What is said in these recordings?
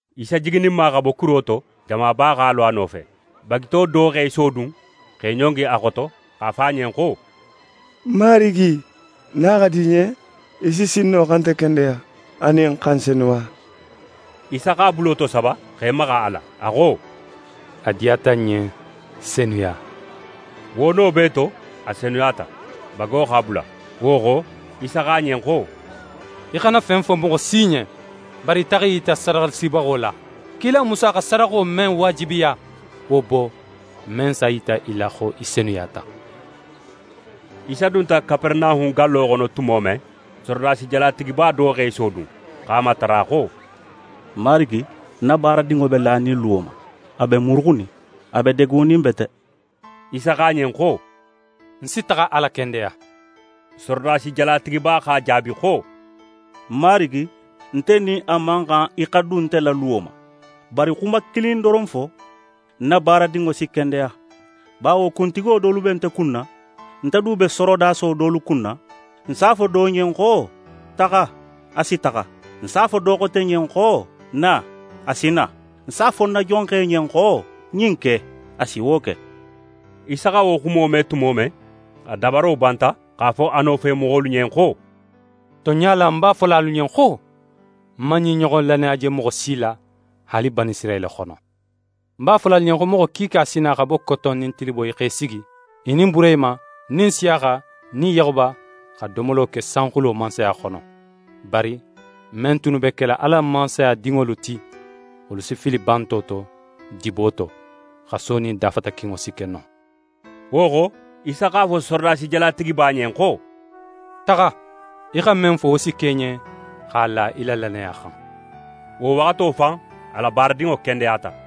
Isa jigininma xa bo kuro to, jamaba x'a lo a nofe. Bagito do x'é sodun, x'é ɲongi a xoto, x'a fo a ɲen xo: «Marigi, nin a xa di í ɲen, í si sin no xa nte kendeya, anin xa ń senuya.» Isa x'a bulo tosaba x'é maxa a la, a xo: «A diyata ń ɲen, senuya!» Wo no bee to, a senuyata, bago x'a bula. Wo xo, Isa xo a ɲen xo: «Í xana fen fo moxo si ɲen, bari taxa í yita sadaxalasibaxo la. Kila Musa xa sadaxo men waajibiya, wo bo, men s'a yita i la xo í senuyata.» Isa dunta Kaperenahun gallo xono tumo men, sorodasi jalatigiba do x'é sodun, x'a matara xo: «Marigi, ń na baaradinŋo be lanin luwo ma, a be muruxunin, a be degunin bete.» Isa xo a ɲen xo: «Ń si taxa a lakendeya.» Sorodasi jalatigiba x'a jaabi xo: «Marigi, nte nin a man xan í xa dun nte la luwo ma, bari xuma kilin doron fo, ń na baaradinŋo si kendeya. Bawo kuntigo dolu be nte kunna, nte du be sorodaso dolu kunna. Ń s'a fo do ɲen xo: “Taxa,” a si taxa. Ń s'a fo do xote ɲen xo: “Na,” a si na. Ń s'a fo ń na jonxe ɲen xo: “Ɲin ke,” a si wo ke.» Isa xa wo xumo me tumo men, a dabaro banta x'a fo a nofemoxolu ɲen xo: «Tonɲa la, ń b'a fola alu ɲen xo: Ń man ɲin ɲoxon lannaya je moxo si la, haali Banisirayila xono. Ń b'a fola alu ɲen xo moxo kiika si na xa bo koton nin tiliboyi x'e sigi, i nin Burehima nin Nsiyaxa nin Yaxuba, xa domolo ke sanxulo Mansaya xono. Bari men tunnu be kela Ala la Mansaya dinŋolu ti, wolu si fili banto to, dibo to. Xaso nin dafatakinŋo si ke non.» Wo xo, Isa x'a fo sorodasi jalatigiba ɲen xo: «Taxa, í xa men fo, wo si ke í ɲen, x'a la í la lannaya xan.» Wo waxato fan, a la baaradinŋo kendeyata.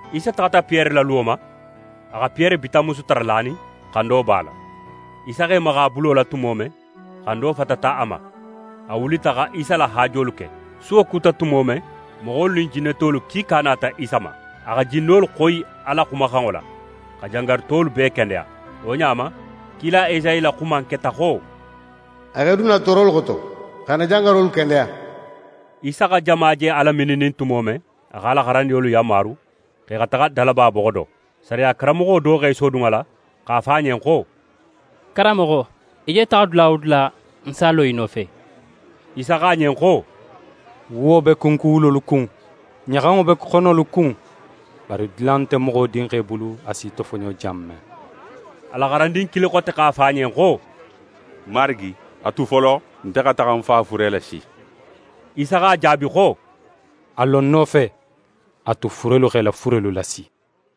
Isa taxata Piyere la luwo ma. A xa Piyere bitanmusu tara lanin, xando b'a la. Isa x'é maxa a bulo la tumo men, xando fatata a ma. A wulita xa Isa la haajolu ke. Suwo kuta tumo men, moxolu nin jinnetolu kiika nata Isa ma. A xa jinnolu xoyi a la xumaxanŋo la, xa jangarutolu bee kendeya. Wo ɲa ma, kila Esayi la xuma in keta xo: «A x'é dun n na toorolu xoto, xa n na jangarolu kendeya.» Isa xa jama je a lamininnin tumo men, a x'a la xarandinŋolu yanmaru xo i xa taxa dalaba boxo do. Sariya karanmoxo do x'é sodun a la x'a fo a ɲen xo: «Karanmoxo, í je taxa dula wo dula, ń s'a lo í nofe.» Isa xo a ɲen xo: «Wuwo be kunkuwulolu kun, ɲaxanŋo be xonolu kun, bari dula nte Moxo Dinxe bulu, a s'í tofoɲo jan men.» A la xarandin kilin xote x'a fo a ɲen xo: «Marigi, a tu folo, nte xa taxa ń fa fure lasi.» Isa x'a jaabi xo: «A lo ń nofe, a tu furelu x'e la furelu lasi.»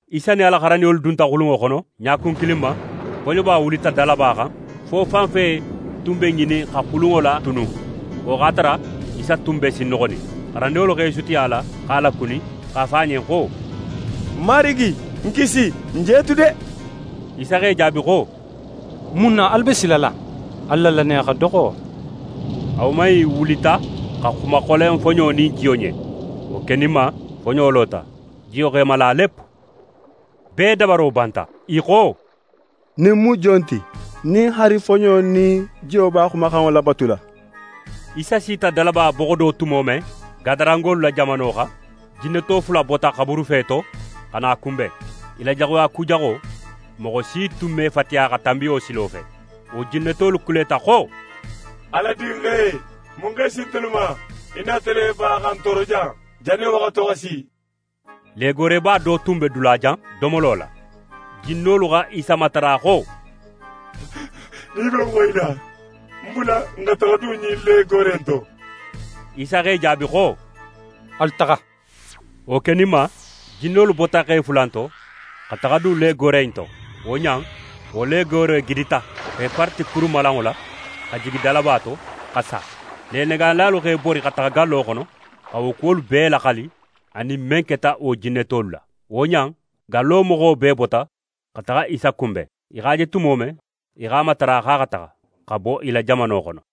Isa nin a la xarandinŋolu dunta xulunŋo xono. Ɲakun kilin ma, foɲoba wulita dalaba xan fo fanfe tun be ŋinin xa xulunŋo latunu. Wo x'a tara, Isa tun be sinnoxonin. Xarandinŋolu x'e sutiya a la, x'a lakuni, x'a fo a ɲen xo: «Marigi, n kisi! N je tu de!» Isa x'e jaabi xo: «Mun na alu be silala? Alu la lannaya xa doxo.» A woman in wulita xa xuma xolen foɲo nin jiyo ɲen. Wo keninma, foɲo lota, jiyo x'é mala lep. Bee dabaro banta, i xo: «Ɲin mu jon ti, nin haali foɲo nin jiyo b'a xumaxanŋo labatula?» Isa sita dalaba boxo do tumo men, Gadarangolu la jamano xan, jinneto fula bota xaburufe to xa na a kunben. I la jaxuya kujaxo, moxo si tun me fatiya xa tanbi wo silo fe. Wo jinnetolu kuleta xo: «Ala Dinxe, mun x'é si ntelu ma? Í nata le ba xa n tooro jan, jannin waxato xa si?» Legooreba do tun be dulajan, domolo la. Jinnolu xa Isa matara xo: «Nin í be n xoyila, n bula n xa taxa dun ɲin legoore in to.» Isa x'e jaabi xo: «Alu taxa!» Wo keninma, jinnolu bota xe fula innu to, xa taxa dun legoore in to. Wo ɲa in, wo legoore gidita, x'e parati kurumalanŋo la, xa jigi dalaba to, xa sa. Lenegaanilalu x'e bori xa taxa gallo xono, xa wo kuwolu bee laxali, anin men keta wo jinnetolu la. Wo ɲa in, gallo moxo bee bota xa taxa Isa kunben. I x'a je tumo men, i x'a matara xo a xa taxa, xa bo i la jamano xono.